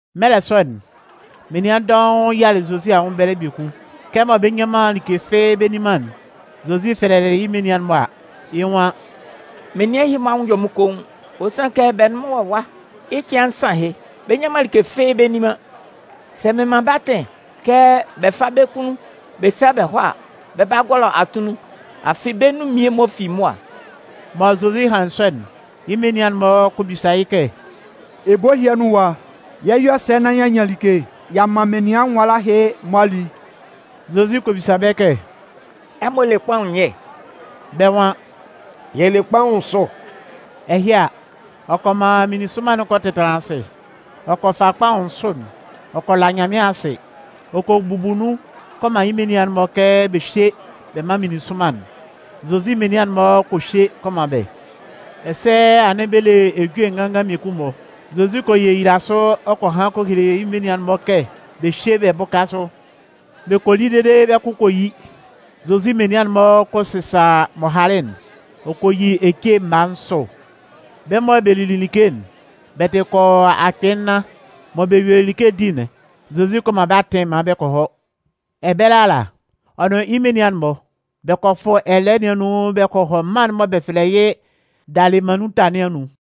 Mɛlɛ sɔ'n, menian dɔʋn yialɩ Zozi anwʋn ɛbɛlɛ biekun. Kɛmɔ bɛ nnyan man like fɩ́ɩ́ bɛ nni man'n, Zozi fɛlɛlɩ yɩ́ menian'n-mɔ a, yɩ́ nwan: “Menian ɛhɩ-mɔ anwʋn yɔ mɩ́n koun. Ɔ sanlɩn kɛ bɛ nʋn mɩ́n wɔ ɛwa yɩ́ cɩan nsan ahɩ, bɛ nnyan man like fɩ́ɩ́ bɛ nni man. Sɛ mɩn man bɛ́ atɩn kɛ bɛ fá bɛ́ kunnun bɛ sá bɛ hɔ́ a, bɛ 'ba gɔlɔ atunnun. Afɩ bɛ́ nun mmie-mɔ fi mʋa.” Mɔ Zozi hanlɩn sɔ'n, yɩ́ menian'n-mɔ kɔ bisa yɩ́ kɛ: “Ebo ɛhɩ anun ɛwa, yɛ 'yɔ sɛ nán y'a nyan like y'a man menian nwala ɛhɩ-mɔ a li?” Zozi kɔ bisa bɛ́ kɛ: “Ɛmɔ le kpaʋn nyɛ?” Bɛ́ nwan: “Yɛ le kpaʋn nsʋ.” Ɛhɩ a, ɔ kɔ man meninsʋnman'n kɔ tɛtanlan asɩ. Ɔ kɔ fa kpaʋn nsʋ'n, ɔ kɔ la Nyanmɩan asɩ. Ɔ kɔ bubu nun kɔ man yɩ́ menian'n-mɔ kɛ bɛ hyé bɛ mán meninsʋnman'n. Zozi menian'n-mɔ kɔ hye kɔ man bɛ́. Ɛsɛ anɩn bɛ le ejue nganngan mmiekun-mɔ. Zozi kɔ yeyila sʋ ɔ kɔ han kɔ hele yɩ́ menian'n-mɔ kɛ bɛ hyé bɛ bʋ́ka sʋ. Bɛ kɔ li dede bɛ́ kʋ kɔ yi. Zozi menian'n-mɔ kɔ sɩsa m'ɔ halɩ'n. Ɔ kɔ yi ece mma nsʋ. Bɛ́ mɔ bɛ lili like'n, bɛ tɩ kɔ yɔ akpɩɩ nnan. Mɔ bɛ yuelɩ like'n di'n, Zozi kɔ man bɛ́ atɩn maan bɛ kɔ hɔ. Ɛbɛlɛ ala, ɔ nʋn yɩ́ menian'n-mɔ, bɛ kɔ fʋ ɛlɛɛ nɩn anun bɛ kɔ hɔ mân'n mɔ bɛ fɛlɛ yɩ́ Dalɩmannunta nɩn anun.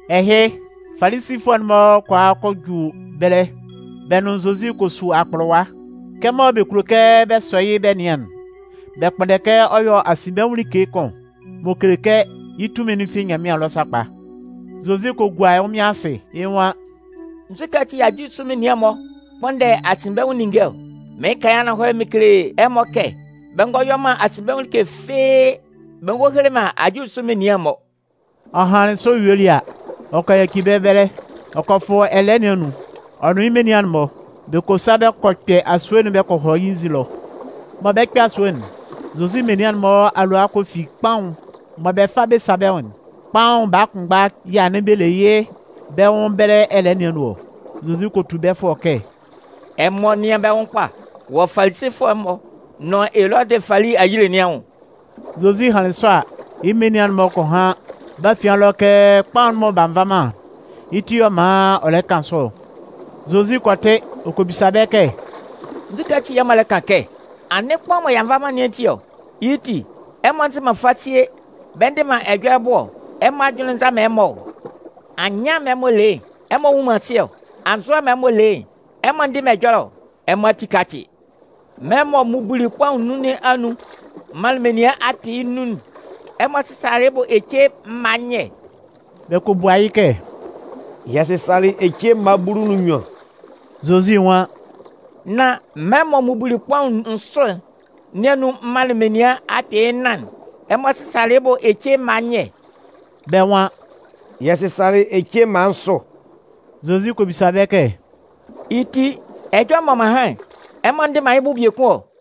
Ɛhɩ, Falisifʋɛ'n-mɔ kɔ a kɔ ju ɛbɛlɛ. Bɛ nʋn Zozi kɔ su akpʋlʋwa. Kɛmɔ bɛ kulo kɛ bɛ sɔ yɩ́ bɛ nɩan'n, bɛ kpʋnndɛ kɛ ɔ yɔ́ asinbɛnwʋn like kʋn m'ɔ kele kɛ yɩ́ tunmin'n fi Nyanmɩan ɛlɔ sakpa. Zozi kɔ gua ɛnwʋnmɩan asɩ, yɩ́ nwan: “Nzukɛ ati yɛ̂ ajulisʋ menian'n-mɔ kpʋnndɛ asinbɛnwʋn ninnge ɔ? Mɩɩn kan yɩ́ ananhɔlɛ mɩn kele ɛmɔ kɛ bɛ ngɔ yɔ man asinbɛnwʋn like fɩ́ɩ́ bɛ ngɔ hele man ajulisʋ menian'n-mɔ.” Ɔ hanlɩn sɔ yuelɩ a, ɔ kɔ yaci bɛ́ ɛbɛlɛ. Ɔ kɔ fʋ ɛlɛɛ nɩn anun, ɔ nʋn yɩ́ menian'n-mɔ, bɛ kɔ sa bɛ kɔ kpɛ asue'n bɛ kɔ hɔ yɩ́ nzin ɛlɔ. Mɔ bɛ 'kpɛ asue'n, Zozi menian'n-mɔ alʋa kɔ fi kpaʋn mɔ bɛ 'fa bɛ sa bɛ́ nwʋn'n. Kpaʋn baa kʋnmgba yɛ̂ anɩn bɛ le yɩ́ bɛ nwʋn ɛbɛlɛ ɛlɛɛ nɩn anun ɔ. Zozi kɔ tu bɛ́ fʋɔ kɛ: “Ɛmɔ nɩ́an bɛ́ nwʋn kpa wɔ Falisifʋɛ'n-mɔ nʋn Elɔdɩ fali ayile nɩn anwʋn.” Zozi hanlɩn sɔ a, yɩ́ menian'n-mɔ kɔ han yɩ́ bɛ́ afian ɛlɔ kɛ kpaʋn'n mɔ b'a nva man'n, yɩ́ ti yɛ̂ ɔ man ɔ lɛ kan sɔ ɔ. Zozi kɔ tɩ, ɔ kɔ bisa bɛ́ kɛ: “Nzukɛ ati yɛ̂ ɛmɔ lɛ kan kɛ: ‘Anɩn kpaʋn'n mɔ y'a nva man nɩn ati ɔ’? Yɩ́ ti, ɛmɔ nzɩ man fasie bɛ ndɩ man ɛjɔlɛ bʋ ɔ? Ɛmɔ ajʋnlɩn nza man ɛmɔ ɔ? Anyɩan'n mɔ ɛmɔ le yɩ́'n, ɛmɔ nnwun man asɩ ɔ? Anzʋɛ'n mɔ ɛmɔ le yɩ́'n, ɛmɔ ndɩ man ɛjɔlɛ ɔ? Ɛmɔ ati kácɩ, mɛlɛ mɔ m mubuli kpaʋn nnun nɩn anun m manlɩn menian akpɩɩ nnun'n, ɛmɔ sɩsalɩ yɩ́ bʋ ece mma nyɛ?” Bɛ kɔ bua yɩ́ kɛ: “Yɛ sɩsalɩ ece mma bulu nʋn nnyuan.” Zozi nwan: “Nán mɛlɛ mɔ m mubuli kpaʋn nsʋ nɩn anun m manlɩn menian akpɩɩ nnan'n, ɛmɔ sɩsalɩ yɩ́ bʋ ece mma nyɛ?” Bɛ́ nwan: “Yɛ sɩsalɩ ece mma nsʋ.” Zozi kɔ bisa bɛ́ kɛ: “Yɩ́ ti, ɛjɔlɛ'n mɔ m'an han'n, ɛmɔ ndɩ man yɩ́ bʋ biekun ɔ?”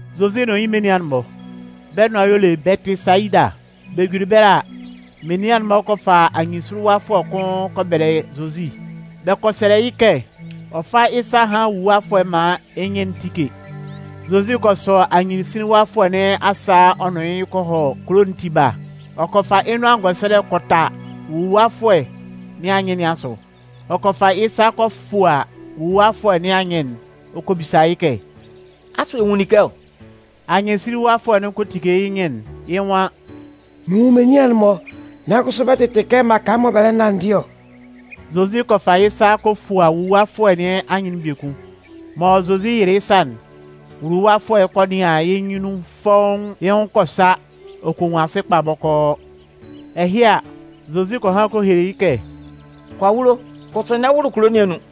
Zozi nʋn yɩ́ menian'n-mɔ, bɛ́ nʋan y'ɔ le Bɛtɩsayida. Bɛ juli ɛbɛlɛ a, menian'n-mɔ kɔ fa anyɩnsinlinwafʋɛ kʋn bɛ kɔ bɛlɛ Zozi. Bɛ kɔ sɛlɛ yɩ́ kɛ ɔ fá yɩ́ sa hán wuluwafʋɛ'n maan yɩ́ nyɩn'n tíke. Zozi kɔ sɔ anyɩnsinlinwafʋɛ nɩn asa ɔ nʋn yɩ́ kɔ hɔ kulo'n tiba. Ɔ kɔ fa yɩ́ nʋan ngɛsɛlɛ kɔ ta wuluwafʋɛ nɩn anyɩn nɩn asʋ. Ɔ kɔ fa yɩ́ sa kɔ fua wuluwafʋɛ nɩn anyɩn'n ɔ kɔ bisa yɩ́ kɛ: “Asʋ ɛ nwun like ɔ?” Anyɩnsinlinwafʋɛ'n kɔ tike yɩ́ nyɩn'n, yɩ́ nwan: “Mɩn nwun menian'n-mɔ, nan kʋsʋ bɛ tɩtɩ kɛ mmaka mɔ bɛ lɛ nanndɩ ɔ.” Zozi kɔ fa yɩ́ sa kɔ fua wuluwafʋɛ nɩn anyɩn'n biekun. Mɔ Zozi yɩlɩ yɩ́ sa'n, wuluwafʋɛ'n kɔ nɩan yɩ́ nyunnun fɔ́ʋ́n. Yɩ́ nwʋn kɔ sa ɔ kɔ nwun asɩ kpa bɔkɔɔ. Ɛhɩ a, Zozi kɔ han kɔ hele yɩ́ kɛ: “Kɔ awulo, kʋsʋ n'ɛ wʋlʋ kulo nɩn anun.”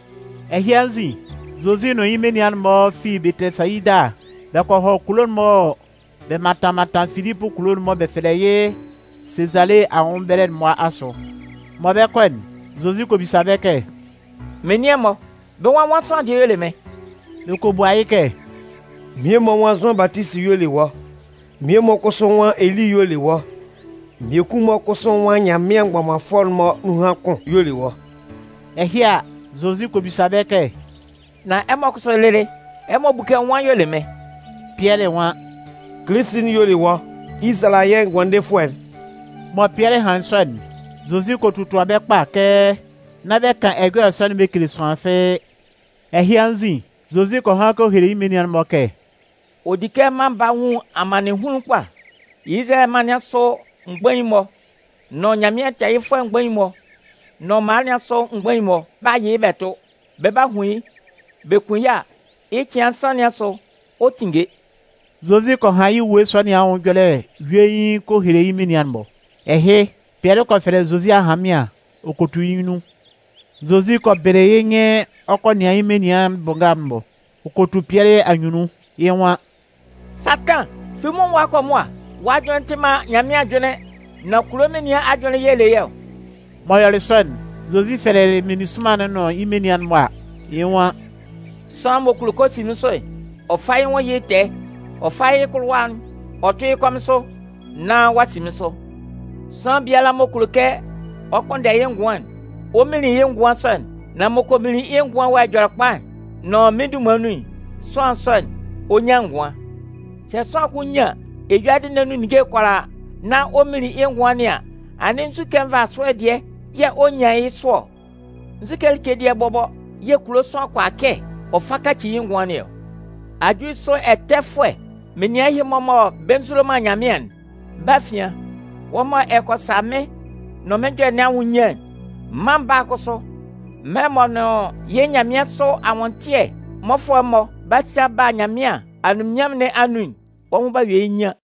Ɛhɩ anzin, Zozi nʋn yɩ́ menian'n-mɔ fi Bɛtɩsayida bɛ kɔ hɔ kulo'n-mɔ mɔ bɛ mantan mantan Filipʋ kulo'n mɔ bɛ fɛlɛ yɩ́ Sezale anwʋn ɛbɛlɛ'n-mɔ asʋ. Mɔ bɛ 'kɔ'n, Zozi kɔ bisa bɛ́ kɛ: “Menian'n-mɔ, bɛ́ nwan nwan sʋanlan dɩɛ y'ɔ le mɩ́n?” Bɛ kɔ bua yɩ́ kɛ: “Mmie-mɔ nwan Zʋan Batisi y'ɔ le wɔ́, mmie-mɔ kʋsʋ nwan Eli y'ɔ le wɔ́, mmiekun-mɔ kʋsʋ nwan Nyanmɩan mgbɔmanfʋɛ'n-mɔ nunhan kʋn y'ɔ le wɔ́.” Ɛhɩ a, Zozi kɔ bisa bɛ́ kɛ: “Nan ɛmɔ kʋsʋ lɩlɩ, ɛmɔ bu kɛ nwan y'ɔ le mɩ́n?” Pɩɛlɩ nwan: “Kilisi'n y'ɔ le wɔ́, Izalayɛ Ngʋandefʋɛ'n.” Mɔ Pɩɛlɩ hanlɩn sɔ'n, Zozi kɔ totua bɛ́ kpa kɛ nán bɛ kan ɛjɔlɛ sɔ'n bɛ kele sʋanlan fɩ́ɩ́. Ɛhɩ anzin, Zozi kɔ han kɔ hele yɩ́ menian'n-mɔ kɛ: “Ɔ di kɛ mân Baa'n nwun amannɩnhunlun kpa. Izalayɛ mân nɩn asʋ mgbain'n-mɔ nʋn Nyanmɩan tɛɛyɩfʋɛ mgbain'n-mɔ nʋn mala nɩn asʋ mgbain'n-mɔ 'ba yɩ yɩ́ tʋ. Bɛ 'ba hun yɩ́. Bɛ kun yɩ́ a, yɩ́ cɩan nsan nɩn asʋ, ɔ 'tinnge.” Zozi kɔ han yɩ́ ewue sɔ nɩn anwʋn ɛjɔlɛ yuein kɔ hele yɩ́ menian'n-mɔ. Ɛhɩ, Pɩɛlɩ kɔ fɛlɛ Zozi ahanmɩan ɔ kɔ tu yɩ́ nyunnun. Zozi kɔ bɩlɩ yɩ́ nyɩn ɔ kɔ nɩan yɩ́ menian bʋ nga'n-mɔ. Ɔ kɔ tu Pɩɛlɩ anyunnun. Yɩ́ nwan: “Satan, fi mɩ́n nwʋn ɛwa kɔ mʋa. Wɔ́ ajʋnlɩn'n tɩ man Nyanmɩan ajʋnlɩn, nan kulo menian ajʋnlɩn yɛ̂ ɛ le yɩ́ ɔ.” M'ɔ yɔlɩ sɔ'n, Zozi fɛlɛlɩ meninsʋnman'n nʋn yɩ́ menian'n-mɔ a, yɩ́ nwan: “Sʋanlan m'ɔ kulo kɛ ɔ si mɩ́n sʋ'n, ɔ fá yɩ́ nwʋn yɩ́ tɛɛ, ɔ fá yɩ́ kʋlʋwa'n ɔ tʋ́ yɩ́ kɔmɩn sʋ, nán ɔ'a si mɩ́n sʋ. Sʋanlan biala m'ɔ kulo kɛ ɔ kpʋnndɛ yɩ́ ngʋan'n, ɔ 'minlin yɩ́ ngʋan sɔ'n. Nan m'ɔ kɔ minlin yɩ́ ngʋan'n wɔ Ɛjɔlɛkpa'n nʋn mɩ́n dunman nun'n, sʋanlan sɔ'n, ɔ 'nyan ngʋan. Sɛ sʋanlan kʋn nyan eyuadɩ nɩn anun ninnge'n kʋalaa nán ɔ minlin yɩ́ ngʋan nɩn an, anɩn nzukɛ nvasʋɛ dɩɛ yɛ̂ ɔ 'nyan yɩ́ sʋ ɔ? Nzu like dɩɛ bɔbɔ yɛ̂ kulo sʋanlan kʋala kɛ ɔ fa kaci yɩ́ ngʋan nɩn ɔ? Ajulisʋ ɛtɛfʋɛ menian ɛhɩ-mɔ mɔ bɛ nzulo man Nyanmɩan'n, bɛ́ afian, wɔ́ mɔ ɛ kɔ sa mɩ́n nʋn mɩ́n ɛjɔlɛ nɩn anwʋn nyian'n, Mân Baa'n kʋsʋ, mɛlɛ m'ɔ nʋn yɩ́ nyanmɩansʋ anwʋntɩɛ mmɔfʋɛ'n-mɔ 'ba sa bɛ ba Nyanmɩan anunminnyanmʋn nɩn anun'n, wɔ́ nwʋn 'ba yɔ yɩ́ nyian.”